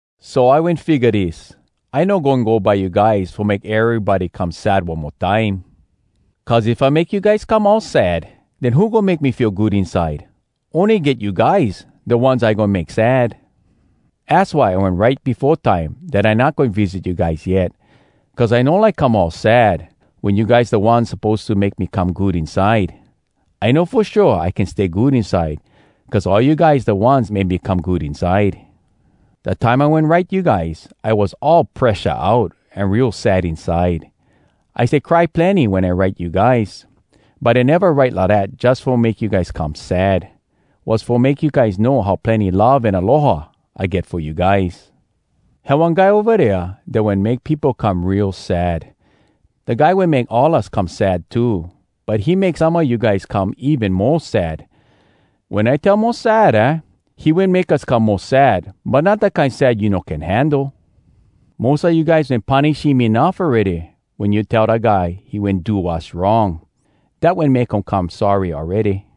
So I wen figga dis: I no goin go by you guys fo make erybody come sad one mo time. Cuz if I make you guys come all sad, den who goin make me feel good inside? Ony get you guys, da ones I goin make sad. Az why I wen write befo time dat I not goin visit you guys yet, cuz I no like come all sad wen you guys da ones suppose to make me come good inside. I know fo shua I can stay good inside cuz all you guys da ones make me come good inside. Da time I wen write you guys, I was all presha out an real sad inside. I stay cry plenny wen I write you guys! But I neva write lidat jus fo make you guys come sad—was fo make you guys know how plenny love an aloha I get fo you guys. Had one guy ova dea dat wen make peopo come real sad. Da guy wen make all us come sad too, but he make some a you guys come even mo sad. Wen I tell “mo sad,” aah, he wen make us come mo sad, but not da kine sad you no can handle. Mos a you guys wen punish him enuff awready wen you tell da guy he wen do wass wrong. Dat wen make um come sorry awready.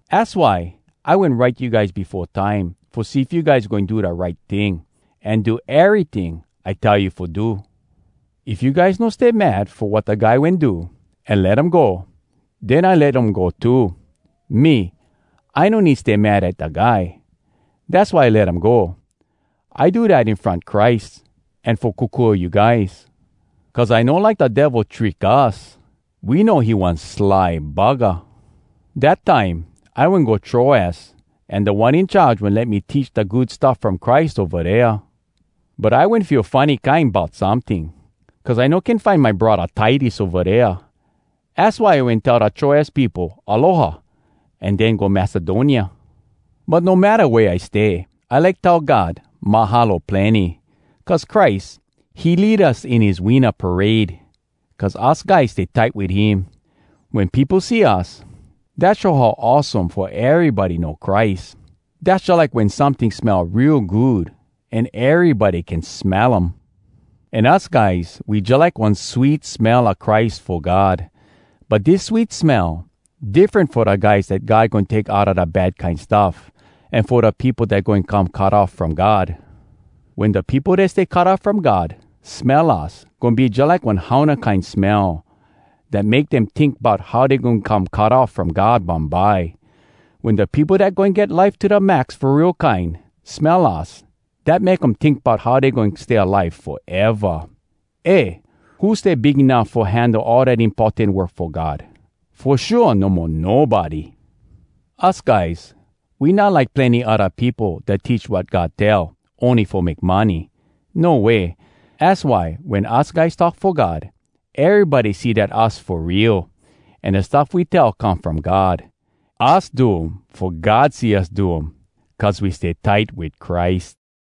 Az why I wen write you guys befo time fo see if you guys goin do da right ting, an do eryting I tell you fo do. If you guys no stay mad fo wat da guy wen do, an let um go, den I let um go too. Me, I no need stay mad at da guy. Dass why I let um go. I do dat in front Christ, an fo kokua you guys. Cuz I no like da Devil trick us. We know he one sly buggah. Dat time, I wen go Troas, an Da One In Charge wen let me teach da Good Stuff From Christ ova dea. But I wen feel funny kine bout someting, cuz I no can find my braddah Titus ova dea. Az why I wen tell da Troas peopo aloha an den go Macedonia. But no matta wea I stay, I like tell God “Mahalo plenny!” Cuz Christ, he lead us in his winna parade, cuz us guys stay tight wit him. Wen peopo see us, dat show how awesome fo erybody know Christ. Dass jalike wen someting smell real good, an erybody can smell um. An us guys, we jalike one sweet smell a Christ fo God. But dis sweet smell, diffren fo da guys dat God goin take outa da bad kine stuff, an fo da peopo dat goin come cut off from God. Wen da peopo dat stay cut off from God smell us, goin be jalike one hauna kine smell dat make dem tink bout how dey goin come cut off from God bumbye. Wen da peopo dat goin get life to da max fo real kine smell us, dat make um tink bout how dey goin stay alive foeva. Eh! Who stay big enuff fo handle all dat importan work fo God? Fo shua, no mo nobody! Us guys, we not like plenny odda peopo dat teach wat God tell, ony fo make money. No way! Az why wen us guys talk fo God, erybody see dat us fo real, an da stuff we tell come from God. Us do um fo God see us do um, cuz we stay tight wit Christ.